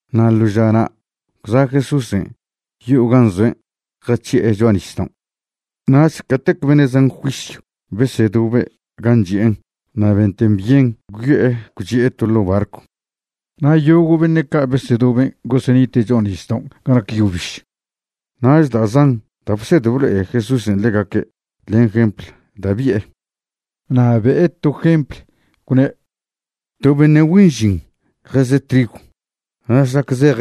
Na' ḻo žana' gwza' Jesúsen' yo'o gan' zoen' jac̱hi'e cho'a nisdaon'. Nach catec beṉe' zan juisyw besedobe' gan' chi'en' na' benten byen gwyo'e gwchi'e to ḻo' barcw. Na' yogo' beṉe' ca' besedoben' gosenite' cho'a nisdaon' ga nac yo biž. Nach da' zan da' bsed blo'e Jesúsen' ḻegaque' len jempl da' bi'e. Na' be'e to jempl, gwne': ―To beṉe' güen žin jeze' trigw, na' šlac zej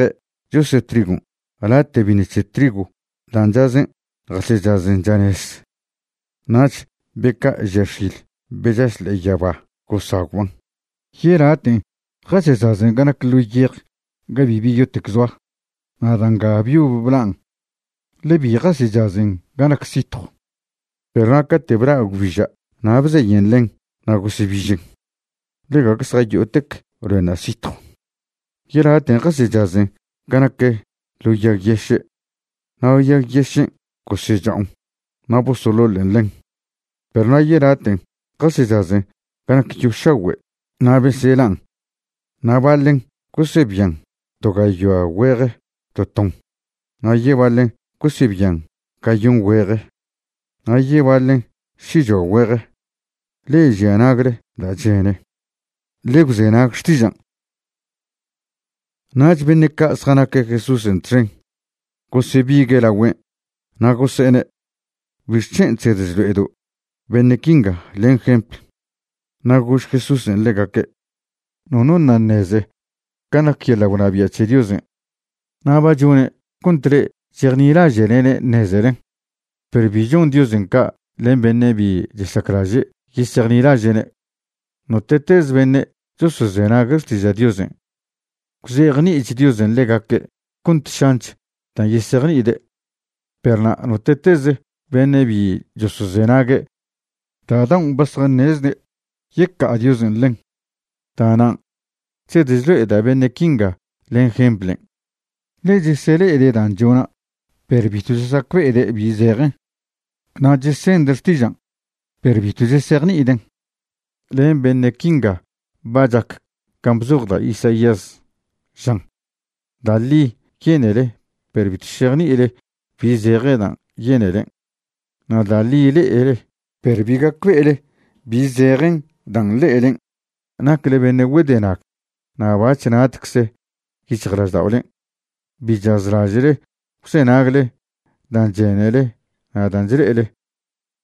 chose' trigon' late' biṉ c̱he trigw dan' chazen' jasechazen chanez, nach be ca' žia x̱il be chaš ḻe'e yaba gosagwban'. Yelaten' jasechazen ga nac ḻo yej ga bibi yotec zoa, na' da' nga byob blan' ḻe bi jasechazen ga nac sitjw. Perw na' cate' bla' gwbiža' na' bzeyen ḻen na' gosebižen, ḻe gague zjayo'otec loenṉa' sitjw. Yelaten' jasechazen ga nac ḻo yag yeše', na' yag yešen' gosecha'on na' bosoḻoḻen ḻen. Perw na' yelaten' jasechazen ga nac yo šagüe' na' beselan'. Na' baḻen' gosebian to gayoa güeje to ton, na' yebaḻen gosebian gayon güeje, na' yebaḻen šichoa güeje. Le'e žia nagle da' chene, ḻe gwzenag xtižan'. Nach beṉe' ca' zjanaque' Jesúsen' txen gosebigue' lagüen', na' gose'ene': ―¿Bixc̱hen' chsed chlo'edo' beṉe' quinga len jempl? Na' gož Jesúsen' ḻegaque': ―Nono ṉa' ṉeze can' nac yeḻa' gwnabia' c̱he Diosen', na' ba chone' cont le'e chejnilaže'lene' ṉezelen. Perw bi chon Diosen' ca' len beṉe' bi chesaclaže' yesejnilaže'ne'. Note'teze beṉe' chosozenague' xtiža' Diosen', gwzejni'ich Diosen' ḻegaque' cont šanch dan' yesejni'ide'. Perw na' note'teze beṉe' bi chosozenague', da' daon' ba zjaṉezde', yeca'a Diosen' ḻen. Da'nan' chsed chlo'eda' beṉe' quinga len jemplen', ḻe chesele'ede' dan' chona' perw bitw chesacbe'ede' bi zejen, na' chesende' xtižan' perw bitw chesejni'iden'. Len beṉe' quinga ba chac can' bzoj da' Isaías, žan: Da' ḻi yenele, perw bitw šejni'ile bi zeje dan' yenelen'. Na' da' ḻi le'ele, perw bi gacbe'ele bi zejen dan' le'elen'. Nacle beṉe' güedenag na' bac̱h natcze yic̱hjlažda'olen'. Bi chazlaže'le gwzenagle dan' chenele na' dan' chle'ele;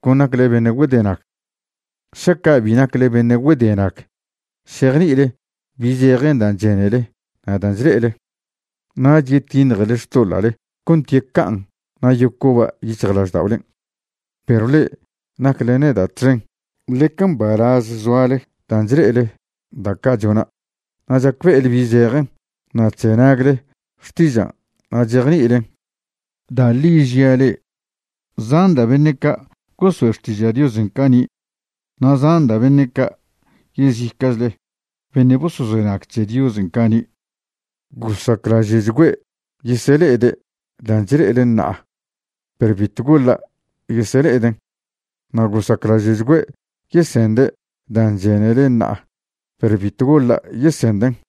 con nacle beṉe' güedenag. Šaca' bi nacle beṉe' güedenag, šejni'ile bi zejen dan' chenele na' dan' chle'ele. Nach yetiṉjele xtoḻa'le cont yeca'an na' yocoba' yic̱hjlažda'olen'. ’Perw le'e nacle neda' txen, ḻeca mbalaz zoale dan' chle'ele da' ca' chona' na' chacbe'ele bi zejen, na' chzenagle xtižan' na' chejni'ilen. Da' ḻi žia' le'e, zan da' beṉe' ca' gosoe' xtiža' Diosen' cani' na' zan da' beṉe' ca' yezica'chle beṉe' bosozenag c̱he Diosen' cani', gosaclaže'chgüe' yesele'ede' dan' chle'ele ṉa'a, perw bitw goḻa' yesele'eden'. Na' gosaclaže'chgüe' yesende' dan' chenele ṉa'a, perw bitw goḻa' yesenden'.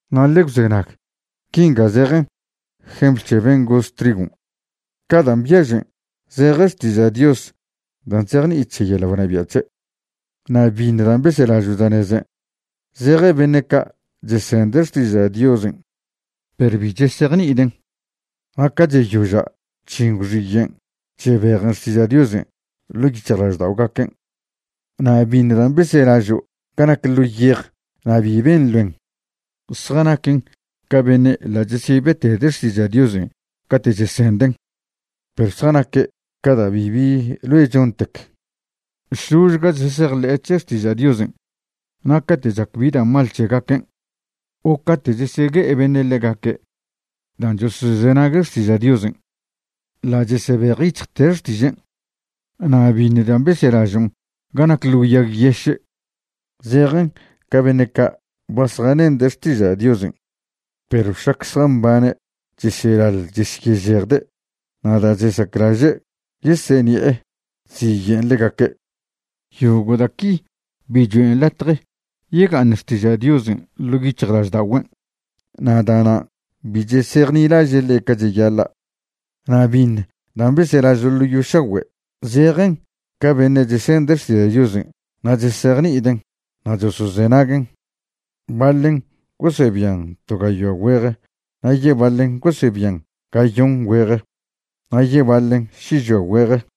’Na' ḻe gwzenag, quinga zejen jempl c̱he ben' goz trigon'. Ca dan' byažen zejen xtiža' Dios da' chzejni'i c̱he yeḻa' gwnabia' c̱he'. Na' biṉ dan' beselažo' chanezen', zejen beṉe' ca' chesende' xtiža' Diosen' perw bi chesejni'iden'. Na' ca cheyoža' chžin gwxiyen' chebejen xtiža' Diosen' ḻo' yic̱hjlažda'ogaquen'. Na' biṉ dan' beselažo' ga nac ḻo yej na' bi ben loen, zjanaquen ca beṉe' ḻa' chesyebetede' xtiža' Diosen' cate' chesenden', perw zjanaque' ca da' bibi loe chontec, šložga chesejḻe'e c̱he xtiža' Diosen', na' cate' chac bi da' mal c̱hegaquen' o cate' chesegue'e beṉe' ḻegaque' dan' chosozenague' xtiža' Diosen', ḻa' chesebejyic̱hjte' xtižen'. Na' biṉ dan' beselažon' ga nac ḻo yag yeše', zejen ca beṉe' ca' ba zjanende' xtiža' Diosen', perw šlac zjambane' chesyelaḻ chesyežejde' na' da' chesaclaže' yeseṉi'e chziye'en ḻegaque'. Yogo' da' qui bi choen' latje yega'aṉ xtiža' Diosen' ḻo' yic̱hjlažda'ogüen', na' da'nan' bi chesejnilaže' ḻe' ca cheyaḻa'. Na' biṉ dan' beselažo' ḻo yo šagüe' zejen ca beṉe' chesende' xtiža' Diosen' na' chesejni'iden' na' chosozenaguen'. Baḻen gosebian to gayoa güeje, na' yebaḻen gosebian gayon güeje, na' yebaḻen šichoa güeje.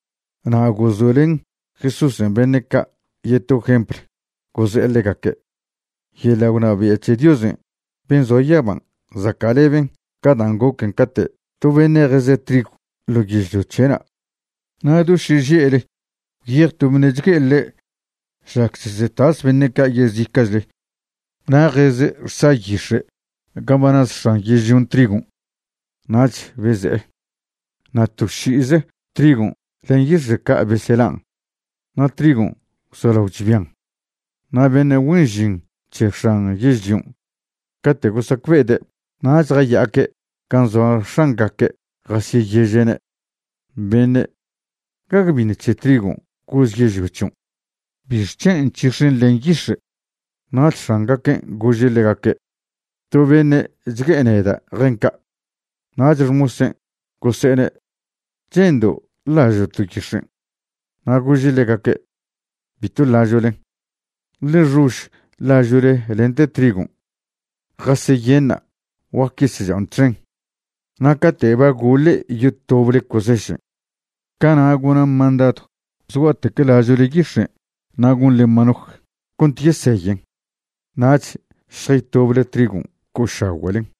Na' gozoe'len Jesúsen' beṉe' ca' yeto jempl, goze'e ḻegaque': ―Yeḻa' gwnabia' c̱he Diosen' ben' zoa yaban' zaca'leben ca dan' goquen' cate' to beṉe' jeze' trigw ḻo yežlio c̱he'na'. Na' do šeže'le gwyej to beṉe' chgue'e ḻe' šlac chesetas beṉe' ca' yezica'chle na' jeze' xsa yix̱e' gan' ba naz x̱an yežlion' trigon', nach beze'e. Na' to ši'ize trigon' len yix̱e' ca' beselan', na' trigon' gwzolao chbian. Na' beṉe' güen žin c̱he x̱an yežlion', cate' gosacbe'ede' nach jaya'aque' gan' zoa x̱angaque' jasyeyeže'ne': “Beṉe', ¿gague biṉ trigon' goz yežlio c̱hion'? ¿Bixc̱hen' nc̱hix̱en len yix̱e'?” Nach x̱angaquen' gože' ḻegaque': “To beṉe' chgue'e neda' jen ca'.” Nach xmosen' gose'ene': “¿Che'ndo' ḻažo'to' yix̱en'?” Na' gože' ḻegaque': “Bitw ḻažo'len. Ḻe xož ḻažo'le lente trigon'. Jaseyenṉa'. Guac yesecha'on txen. Na' cate' ba goḻe' yotoble cosešen', cana' gona' mandadw zgua'tec ḻažo'le yix̱en' na' gonḻen manoj cont yeseyen. Nach šjaytoble trigon' co'ošagüe'len.”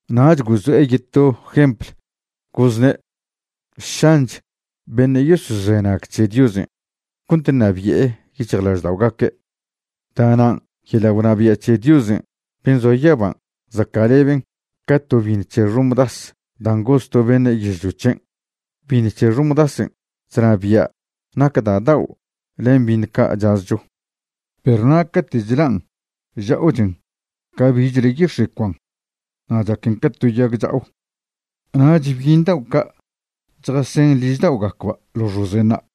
Nach gozo'e yeto jempl, gozne': ―Šanch beṉe' yosozenag c̱he Diosen' cont ṉabi'e yic̱hjlažda'ogaque'. Da'nan' yeḻa' gwnabia' c̱he Diosen' ben' zoa yaban' zaca'leben ca to biṉ c̱he xomdas dan' goz to beṉe' yežlio c̱hen'. Biṉ c̱he xomdasen' chnabia' nac da' dao' len biṉ ca' chazcho. Perw na' cate' chlan' chcha'ochen ca bichle yix̱e' cuan na' chaquen ca to yag cha'o, nach byiṉ dao' ca' chjasen ližda'ogacba' ḻo xozenṉa'.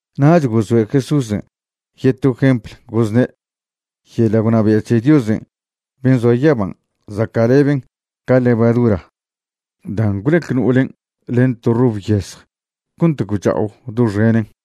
Nach gozoe' Jesúsen' yeto jempl, gozne': ―Yeḻa' gwnabia' c̱he Diosen' ben' zoa yaban' zaca'leben ca levadura dan' gwlec no'olen' len to rob yezj cont gwcha'o doxenen.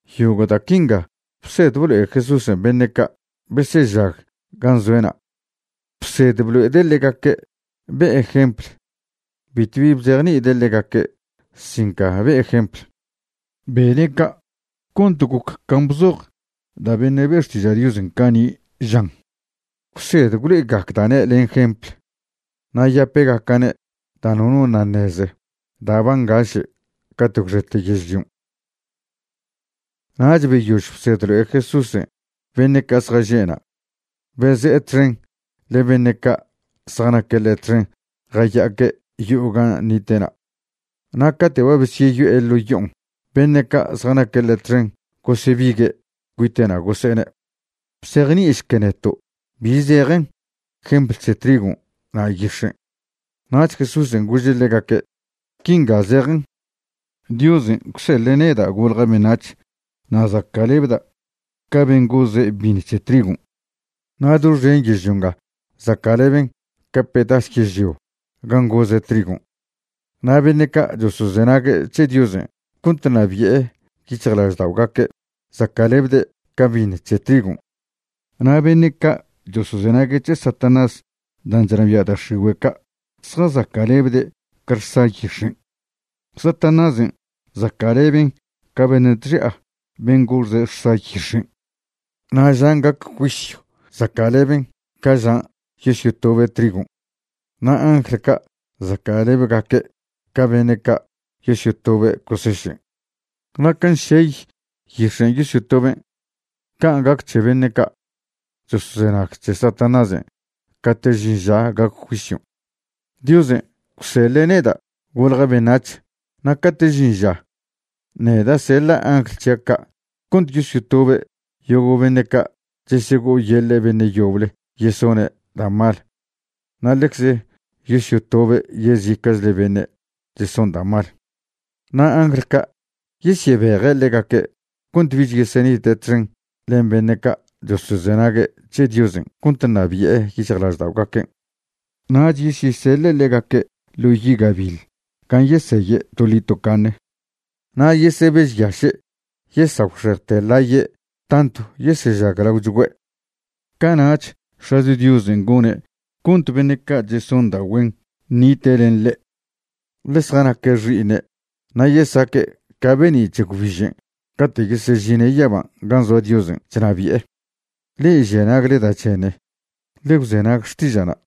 Yogo' da' quinga bsed blo'e Jesúsen' beṉe' ca' besežag gan' zoe'na'. Bsed blo'ede' ḻegaque' be'e jempl, bitwbi bzejni'ide' ḻegaque' sin ca be'e jempl. Bene' ca' cont goc can' bzoj da' beṉe' be' xtiža' Diosen' cani', žan: Gwsed gwlo'egacda'ne' len jempl, na' yapegaca'ne' dan' nono ṉa' ṉeze da' ba ngaše' cate' gwxete yežlion'. Nach beyož bsed blo'e Jesúsen' beṉe' ca' zjaže' na', beze'e txen len beṉe' ca' zjanaque' ḻe' txen jaya'aque' yo'o gan' nite'na'. Na' cate' ba besyeyo'e ḻo' yo'on' beṉe' ca' zjanaque' ḻe' txen gosebigue' cuite'na' gose'ene': ―Bzejni'išque neto' bi zejen jempl c̱he trigon' na' yix̱en'. Nach Jesúsen' gože' ḻegaque': ―Quinga zejen: Diosen' gwseḻe' neda' golja' beṉac̱h na' zaca'lebda' ca ben' goze' biṉ c̱he trigon'. Na' doxen yežlio nga zaca'leben ca pedas yežlio gan' goze' trigon'. Na' beṉe' ca' chosozenague' c̱he Diosen' cont ṉabi'e yic̱hjlažda'ogaque' zaca'lebde' ca biṉ c̱he trigon'. Na' beṉe' ca' chosozenague' c̱he Satanás dan' chnabia' da' x̱igüe' ca' zjazaca'lebde' ca xsa yix̱en'. Satanásen' zaca'leben ca beṉe' chxi'a ben' goze' xsa yix̱en'. Na' žan' gac juisyw zaca'leben ca žan' yosyotobe' trigon'. Na' angl ca' zaca'lebegaque' ca beṉe' ca' yosyotobe' cosešen'. Na' can' šey yix̱en' yosyotoben', can' gac c̱he beṉe' ca' chosozenag c̱he Satanásen' cate' žin ža gac juisyon'. Diosen' gwseḻe' neda' golja' beṉac̱h na' cate' žin ža, neda' seḻa' angl c̱hia' ca' cont yosyotobe' yogo' beṉe' ca' chesego'oyeḻe' beṉe' yoble yesone' da' mal na' ḻecze yosyotobe' yezica'chle beṉe' cheson da' mal. Na' angl ca' yesyebeje' ḻegaque' cont bich yesenite' txen len beṉe' ca' chosozenague' c̱he Diosen' cont ṉabi'e yic̱hjlažda'ogaquen'. Nach yesyeseḻe' ḻegaque' ḻo yi' gabiḻ gan' yeseye' toḻi tocaṉe. Na' yesebežyaše' yesagwxejte ḻaye' tantw yesežaglaochgüe'. Cana'ch X̱acho Diosen' gone' cont beṉe' ca' cheson da' güen ṉite' len ḻe', ḻe zjanaque' xi'iṉe' na' yesaque' ca be'ni' c̱he gwbižen' cate' yesežine' yaban' gan' zoa Diosen' chnabi'e. Le'e žia nagle da' chene, ḻe gwzenag xtiža'na'.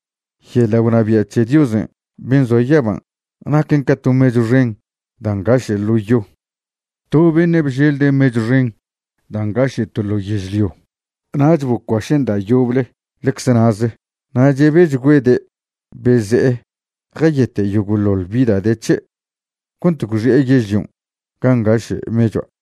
’Yeḻa' gwnabia' c̱he Diosen' ben' zoa yaban' naquen ca to mechw xen dan' ngaše' ḻo' yo. To beṉe' bželde' mechw xen da' ngaše' to ḻo' yežlio. Nach bocuašen' da' yoble ḻecze na'ze na' chebechgüede' beze'e jayete' yogo'ḻoḻ bi da' de c̱he' cont gwxi'e yežlion' gan' ngaše' mechua'.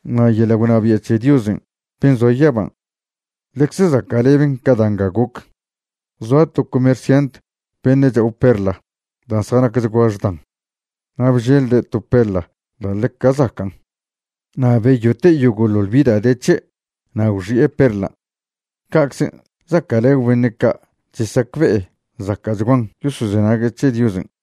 ’Na' yeḻa' gwnabia' c̱he Diosen' ben' zoa yaban', ḻecze zaca'leben ca da' nga goc. Zoa to comerciant beṉe' cha'o perla dan' zjanacchgua xdan. Na' bželde' to perla da' ḻeca zacan'. Na' beyote' yogo'ḻoḻ bi da' de c̱he' na' gwxi'e perlan'. Ca'czen' zaca'lebe beṉe' ca' chesacbe'e zaca'chguan yosozenague' c̱he Diosen'.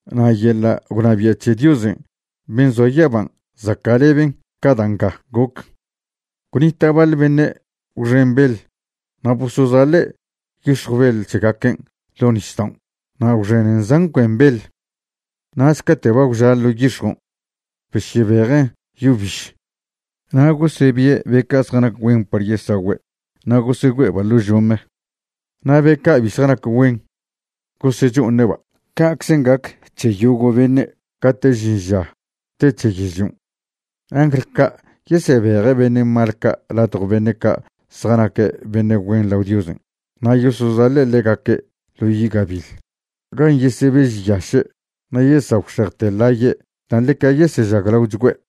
’Na' yeḻa' gwnabia' c̱he Diosen' ben' zoa yaban' zaca'leben ca da' nga goc. Gwnita' baḻ beṉe' gwxen beḻ na' bosozaḻe' yix̱jw beḻ c̱hegaquen' ḻo' nisdaon' na' gwxenen zan cuen beḻ. Nach cate' ba gwža' ḻo' yix̱jon', besyebejen' yo biž, na' gosebie' be ca' zjanac güen par yesagüe' na' gosegüe'eba' ḻo' žome. Na' be ca' bi zjanac güen, gosecho'oṉe'ba'. Ca'czen gac c̱he yogo' beṉe' cate' žin ža te c̱he yežlion'. Angl ca' yesebeje' beṉe' mal ca' ladjo beṉe' ca' zjanaque' beṉe' güen lao Diosen' na' yosozaḻe' ḻegaque' ḻo yi' gabiḻ gan' yesebežyaše' na' yesagwxejte ḻaye' dan' ḻeca yesežaglagüe'.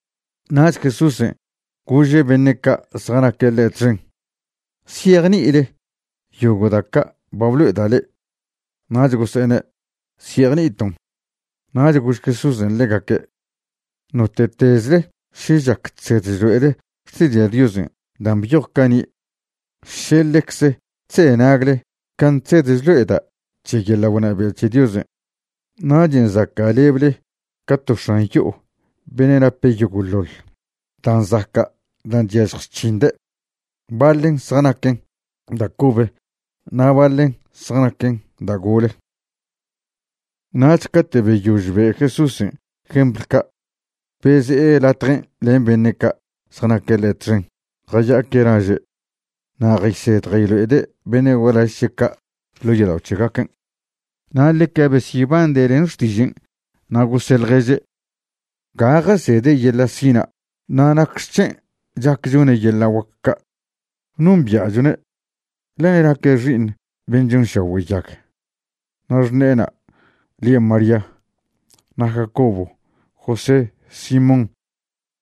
Nach Jesúsen' gože' beṉe' ca' zjanaque' ḻe' txen: ―¿Zyejni'ile yogo' da' ca' ba blo'eda' le'e? Nach gose'ene': ―Zyejni'iton'. Nach gož Jesúsen' ḻegaque': ―Note'tezle še chac chsed chlo'ele Xtiža' Diosen' dan' byoj cani', še ḻecze chzenagle can' chsed chlo'eda' c̱he yeḻa' gwnabia' c̱he Diosen', nachen' zaca'leble ca to x̱an yo'o beṉe' nape' yogo'ḻoḻ da' zaca' dan' chyažj chc̱hinde', baḻen zjanaquen da' cobe na' baḻen zjanquen da' gole. Nach cate' beyož be' Jesúsen' jempl ca', beze'e latjen' len beṉe' ca' zjanaque' ḻe' txen jaya'aque' laže'. Na' jaysed jaylo'ede' beṉe' gualaž c̱he' ca' ḻo' yodao' c̱hegaquen'. Na' ḻeca besyebande' len xtižen' na' gose' ḻježe': ―¿Ga jasede' yeḻa' sina'? na' ¿nacxec̱hen' chac chone' yeḻa' guac ca'? Nombia'chone', ḻe naque' xi'iṉ ben' chonšagüe' yag. Na' xṉe'ena' lie' María, na' Jacobo, José, Simón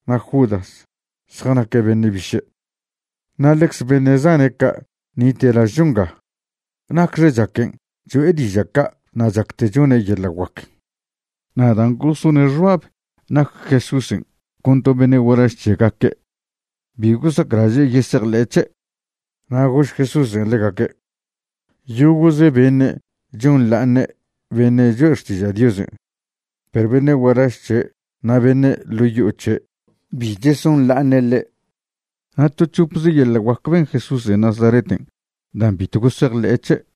na' Judas zjanaque' beṉe' biše'. Na' ḻecze beṉe' zane' ca' nite' lažcho nga. ¿Nacxe chaquen' cho'e diža' ca' na' chacte' chone' yeḻa' guac? Na' dan' gosone' xbab nac Jesúsen' con to beṉe' gualaž c̱hegaque', bi gosaclaže' yesejḻe'e c̱he'. Na' gož Jesúsen' ḻegaque': ―Yogo'ze beṉe' chonḻa'aṉe' beṉe' choe' xtiža' Diosen', perw beṉe' gualaž c̱he' na' beṉe' ḻo' yo'o c̱he' bi chesonḻa'aṉe' ḻe'. Na' to c̱hopze yeḻa' guac ben Jesúsen' Nazareten' dan' bitw gosejḻe'e c̱he'.